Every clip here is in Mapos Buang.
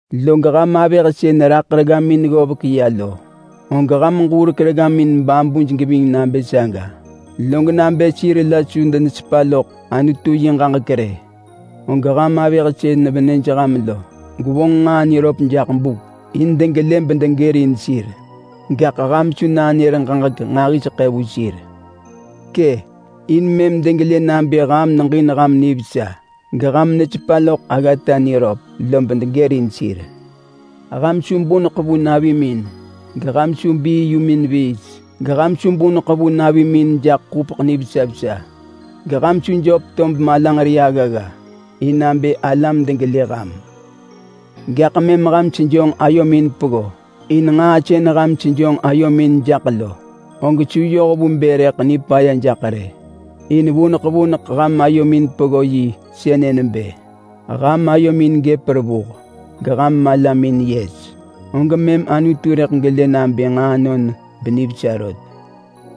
Log ham avëh sën raḳ reggamin ggovek ya lo, og ham ġurek reggamin babuj geving nabë saga. Log nabë sir la su denesepa loḳ Anutu yi ġaġek rë, og ham avëh sën venëj ham lo gwevonġ nġaa niröp jaḳ buk in degelë bedegërin sir. Gaḳ ham su nanër ġaġek nġahiseḳë vu sir. Kë! In mëm degelë nabë ham neġin ham nivesa geham nesepa loḳ aggata niröp, lob degërin sir. Ham su buneḳ vu navimin, geham su bii yumin viis, geham su buneḳ vu navimin jaḳ ḳupeḳ nivesa vesa, geham su jöp tob malanġeri aggagga in nabë alam degelë ham. Gaḳ mëm ham sejonġ ayomin peggo, in nġaa sën ham sejonġ ayomin jaḳ lo, og su yoh vu bë rëḳ nipaya jaḳ rë. In vuneḳ vuneḳ ham ayomin peggo yi sënë nebë: Ham ayomin gëp revuh, geham malamin yes. Og mëm Anutu rëḳ gelë nabë nġaanon benivesa rot.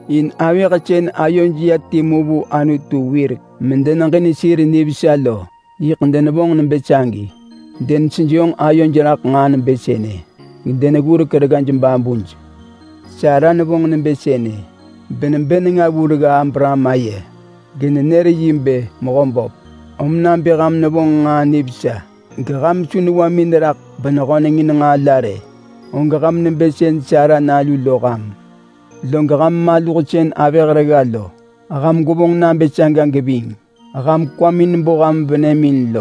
In avëh sën ayoj ya timu vu Anutu wirek medeneġin sir nivesa lo yiḳ denevonġ nebë sagi. Denesejonġ ayoj raḳ nġaa nebë sënë gedeneggurek reggaj babuj. Sara nevonġ nebë sënë, benebë nenga vu regga Abraham aye, genenër yi bë “Mehö böp”. Om nabë ham nevonġ nġaa nivesa, geham su newamin neraḳ benehöneng in nġaa la rë, og ham nebë sën Sara nalu lo ham. Log ham maluh sën avëh regga lo, ham gwevonġ nabë saga geving. Ham kwamin bo ham venëmin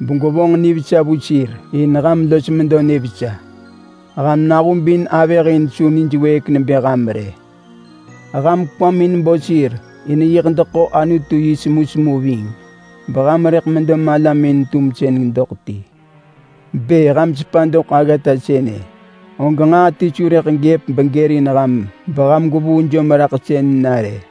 begwevonġ nivesa vu sir in ham los medo nivesa. Ham nahubin avëh in su nij wëëk nebë ham rë. Ham kwamin bo sir in yiḳ deḳo Anutu yi semusemu ving beham rëḳ medo malamin-tumsën doḳ ti. Bë ham sepa doḳ aggata sënë, og nġaa ti su rëḳ gëp begërin ham beham gwevuu jomraḳsën na rë.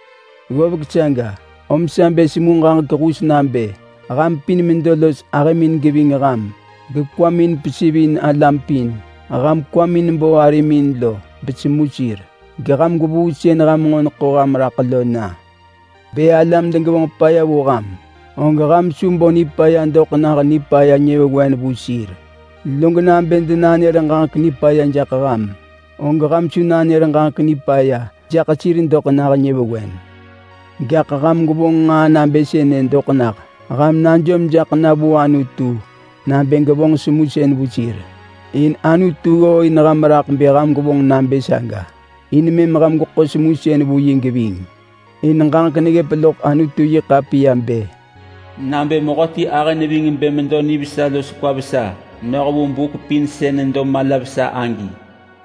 Ggovek saga, om sa bë semu ġaġek hus nabë ham pin medo los ahëmin geving ham gekwamin pesivin alam pin. Ham kwamin bo arimin lo besemu sir, geham gwevuu sën ham nġo neḳo ham raḳ lo na. Bë alam degevonġ paya vu ham, og ham su bo nipaya doḳ nah nipaya nyëvewen vu sir. Log nabë denanër ġaġek nipaya jaḳ ham, og ham su nanër ġaġek nipaya jaḳ sir doḳ nah nyëvewen. Gaḳ ham gwevonġ nġaa nabë sënë doḳ nah: Ham najom jaḳ na vu Anutu nabë gevonġ semusën vu sir. In Anutu ggooin ham raḳ bë ham gwevonġ nabë saga in mëm ham gweḳo semusën vu yi geving. In ġaġek neggëp loḳ Anutu-yi-ḳapiya bë: “Nabë mehöti ahë neving bë medo nivesa los kwa vesa noh vu buk pin sën nedo mala vesa agi,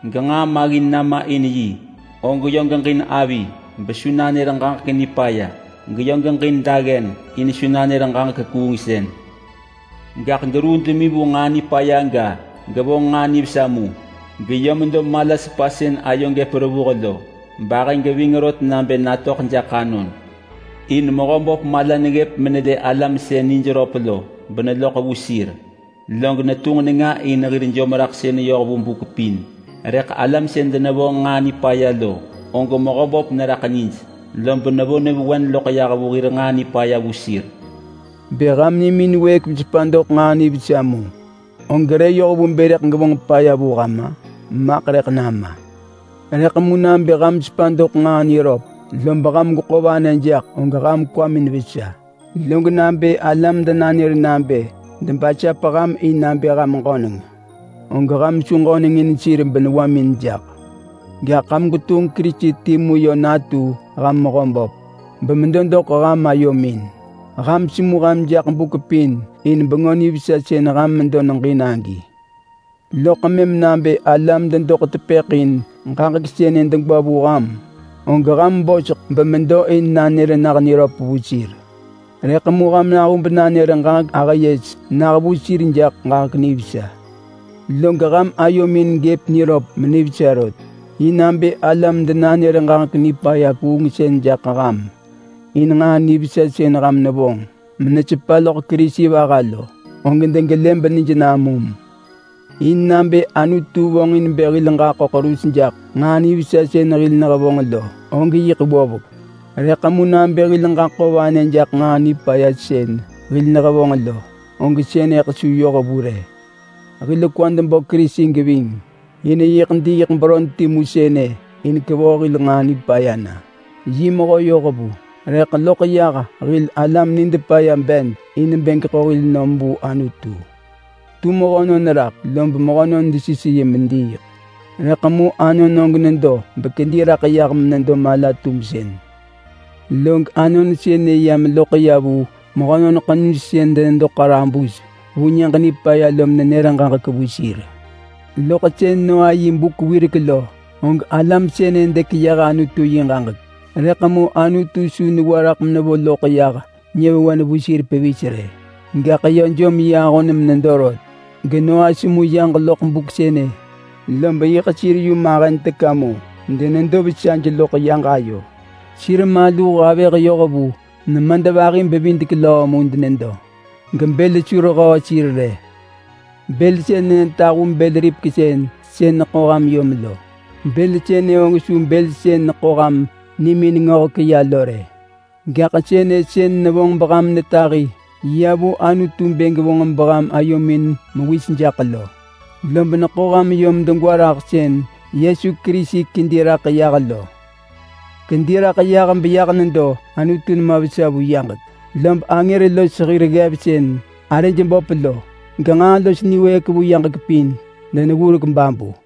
genġaa maggin nama in yi, og yö geġin avi besu nanër ġaġek nipaya, geyö geġin daggen in su nanër ġaġek kuungsën. Gaḳ geruu demi vu nġaa nipaya ga, gevonġ nġaa nivesa mu, geyö medo mala sepa sën ayo gëp revuh lo, bahë geving rot nabë natöḳ jaḳ anon. In Mehöböp mala neggëp menelë alam sën nij röp lo beneloḳ vu sir, log netunġ nenga in hir jomraḳsën yoh vu buk pin. Rëḳ alam sën denevonġ nġaa nipaya lo, og Mehöböp neraḳ nij, lob nevo nyëvewen loḳ yah hir nġaa nipaya vu sir.” Bë ham nimin wëëk mesepa doḳ nġaa nivesa mu, og re yoh vu bë rëḳ gevonġ paya vu ham-a? Maḳ rëḳ nama! Rëḳ mu nabë ham sepa doḳ nġaa niröp lob ham gweḳo vanë jaḳ, og ham kwamin vesa. Log nabë alam denanër nabë debasap ham in nabë ham ġöneng, og ham su ġöneng in sir benewamin jaḳ. Gaḳ ham gwetunġ Kerisi timu yö natu ham Mehöböp bemedo doḳ ham ayomin. Ham semu ham jaḳ buk pin in Bengö Nivesa sën ham medo neġin agi. Loḳ mëm nabë alam dedoḳ tepëḳ in ġaġek sënë degwa vu ham, og ham medo in nanër nah niröp vu sir. Rëḳ mu ham nahub nanër ġaġek ahë yes nah vu sir jaḳ ġaġek nivesa. Log ham ayomin yö gëp niröp menivesa rot. In nabë alam denanër ġaġek nipaya kuungsën jaḳ ham in nġaa nivesa sën ham nevonġ menesepa loḳ Kerisi vaha lo, og degelë benij namum. In nabë Anutu vonġin bë hil ġaḳo ḳerus jaḳ nġaa nivesa sën hil nehevonġ lo, og yiḳ ggovek. Rëḳ mu nabë hil ġaḳo vanë jaḳ nġaa nipaya sën hil nehevonġ lo, og sënëḳ su yoh vu rë. Hil kwad bo Kerisi geving, in yiḳ diiḳ beron timu sënë in kevoh hil nġaa nipaya na. Yi mehö yohvu rëḳ loḳ yah hil alam nid paya bed in bë geḳo hil nom vu Anutu. Tu mehönon raḳ lob mehönon desis yi mediiḳ, rëḳ mu Anon og nedo bekedi raḳ yah menedo mala-tumsën. Log Anon sënë ya meloḳ ya vu mehönon ḳenuj sën denedo ḳarabus vu Nyëġ Nipaya lo menër ġaġek vu sir. Loḳ sën Noa yi buk wirek lo, og alam sënë dekeyëh Anutu yi ġaġek, rëḳ mu Anutu su newa raḳ mevo loḳ yah nyëvewen vu sir pevis rë. Gaḳ yö jom yi ahon menedo rot, geNoa semu yaġ loḳ buk sënë, lob yiḳ sir yu mahen teka mu denedo vesaj loḳ yaġ ayo. Sir maluh avëh yoh vu nemadvahi-bevidek-löö denedo mu gebël su rehöö sir rë. Bël sënë netahu bël-ripeksën sën neḳo ham yom lo. Bël sënë og su bël sën neḳo ham nimin ngöhek ya lo rë, gaḳ sënë sën nevonġ beham netahi ya vu Anutu bë gevonġ beham ayomin mewis jaḳ lo. Lob neḳo ham yom degwa raḳ sën Yesu Kerisi kedi raḳ yah lo. Kedi raḳ yah beyah nedo Anutu nema vesa vu yaġek, lob angër los hir ggev sën arëj böp lo, genġaa los niwëëk vu yaġek pin, deneggurek babu.